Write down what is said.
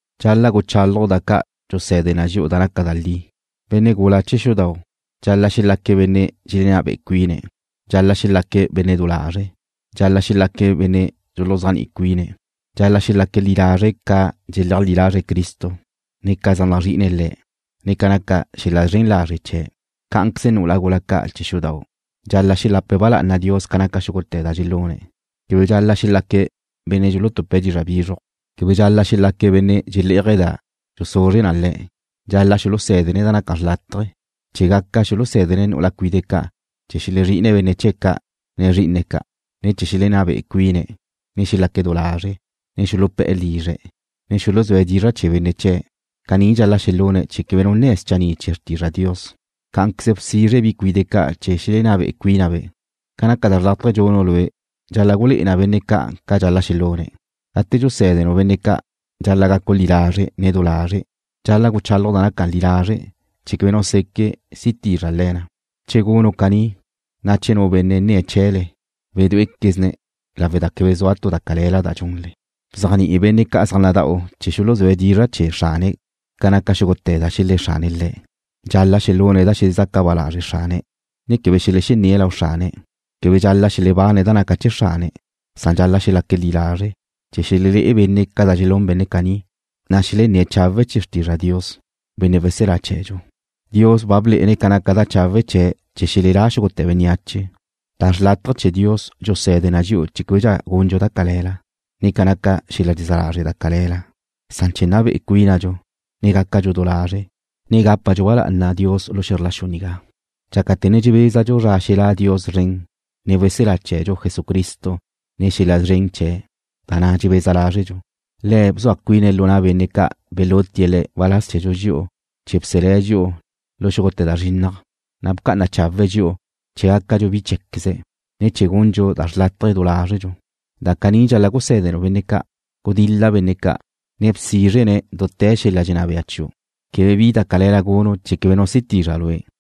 Dxal-la' guchálaju' da ca' dxuse̱de na dxi'u da naca li. Benne' gula chee̱ xudau': Dxal-la' xelaque̱' benne' dxelenná bé'e cuine̱'. Dxal-la' xelaque̱' benne' du lazre'. Dxal-la' xelaque̱' benne' dxuluzéajni'i cuine̱'. Dxal-la' xelaque̱' li lazre' ca dxleajlí lazre̱' Cristo, ne ca zaj nazrí'ine̱' Le̱', ne ca naca xel-la zren lazre' chee̱'. Cá'anqueze nu'ula gula ca' chee̱ xudau': Dxal-la' dxelapa ba lá'ana Dios ca naca xúgute̱ da dxelune̱'. Quebe dxal-la' xelaque̱' benne' dxulutupe̱' dizra' bizruj. Quebe dxal-la' xelaque̱' benne' dxelé'aje̱' da xuzuzre na le̱'. Dxal-la' xulusé̱dene̱' da naca xrlataje̱ chee̱ gaca xulusé̱dene̱' nu'ula cuide' ca' chee̱ xelezrí'ine̱' benne' chee̱' ca', ne zrí'ine̱' ca', ne chee̱ xelenná be'e cuine̱', ne xelaque' du lazre', ne xulupe̱'e̱ lizre̱', ne xuluzúe̱' dizra' chee̱ benne' chee̱'. Caní dxal-la' xelune̱' chee̱ quebe nu nne̱' schanní' chee̱ xrtizra' Dios. Cá'anqueze bsizre bi cuide' ca' chee̱ xelenná be'e cuínabe'. Ca naca da xrlátaje dxunu' lue' dxal-la' gulé'e na benne' ca' ca dxal-la' xelune̱'. Gate dxusé̱denu' benne' ca' dxal-la' gacu' li lazre', ne du lazre'. Dxal-la' guchálaju' da naca li lazre' chee̱ quebe nu seque' si tizra le̱ na. Che gunu' caní, na' che nu benne' nnie̱' chee̱le, wedué'equezne̱', lawe' da quebe sua tu da cale̱la da dxunle. Bzéajni'i benne' ca' zaj nada'u chee̱ xuluzúe̱' dizra' chee̱ xrane̱' ca naca xúgute̱ da xelé̱ xrane̱' le̱'. Dxal-la' xelune̱' da xelexezaca ba lazre' xrane̱', ne quebe xelexenné̱' lau xrane̱'. Quebe dxal-la' xelebane̱' da naca chee̱ xrane̱', san dxal-la' xelaque̱' li lazre', chee̱ xelelé'e benne' ca da dxelún benne' caní, na' xelenné̱' chawe' chee̱ xrtizra' Dios, Benne' weselá chee̱dxu. Dios ba blé'ene̱' ca naca da chawe' chee̱' chee̱ xelelá xúgute̱ bénneache. Da xrlátaje chee̱ Dios dxuse̱de na dxi'u chee̱ québedxa gundxu da cale̱la, ne ca naca xel-la dxezá lazre' da cale̱la, san chee̱ nna be'e cuínadxu, ne gácadxu du lazre', ne gápadxu ba lá'ana Dios lu xe̱zr la xu nigá dxácate̱ ne dxebézadxu zra xelá' Dios szren, ne weselá chee̱dxu Jesucristo nen xel-la szren chee̱', da na' dxebeza lázredxu. Le̱' bzua cuine̱' lu na' benne' ca' belútie̱' Le̱' waláz chee̱dxu dxi'u chee̱ bselé̱' dxi'u lu xúgute̱ da zrinnaj, na' bca'ana chawe̱' dxi'u chee̱ gácadxu bi cheé̱queze̱', ne chee̱ gundxu da xrlátaje du lázredxu. Da caní dxal-la' gusé̱denu' benne' ca'. Gudil-la benne' ca', ne bsizre-ne̱' dute̱ xel-la dxenná bea chiu'. Quebe bi da cale̱la gunu' chee̱ quebe nu si tizra lue'.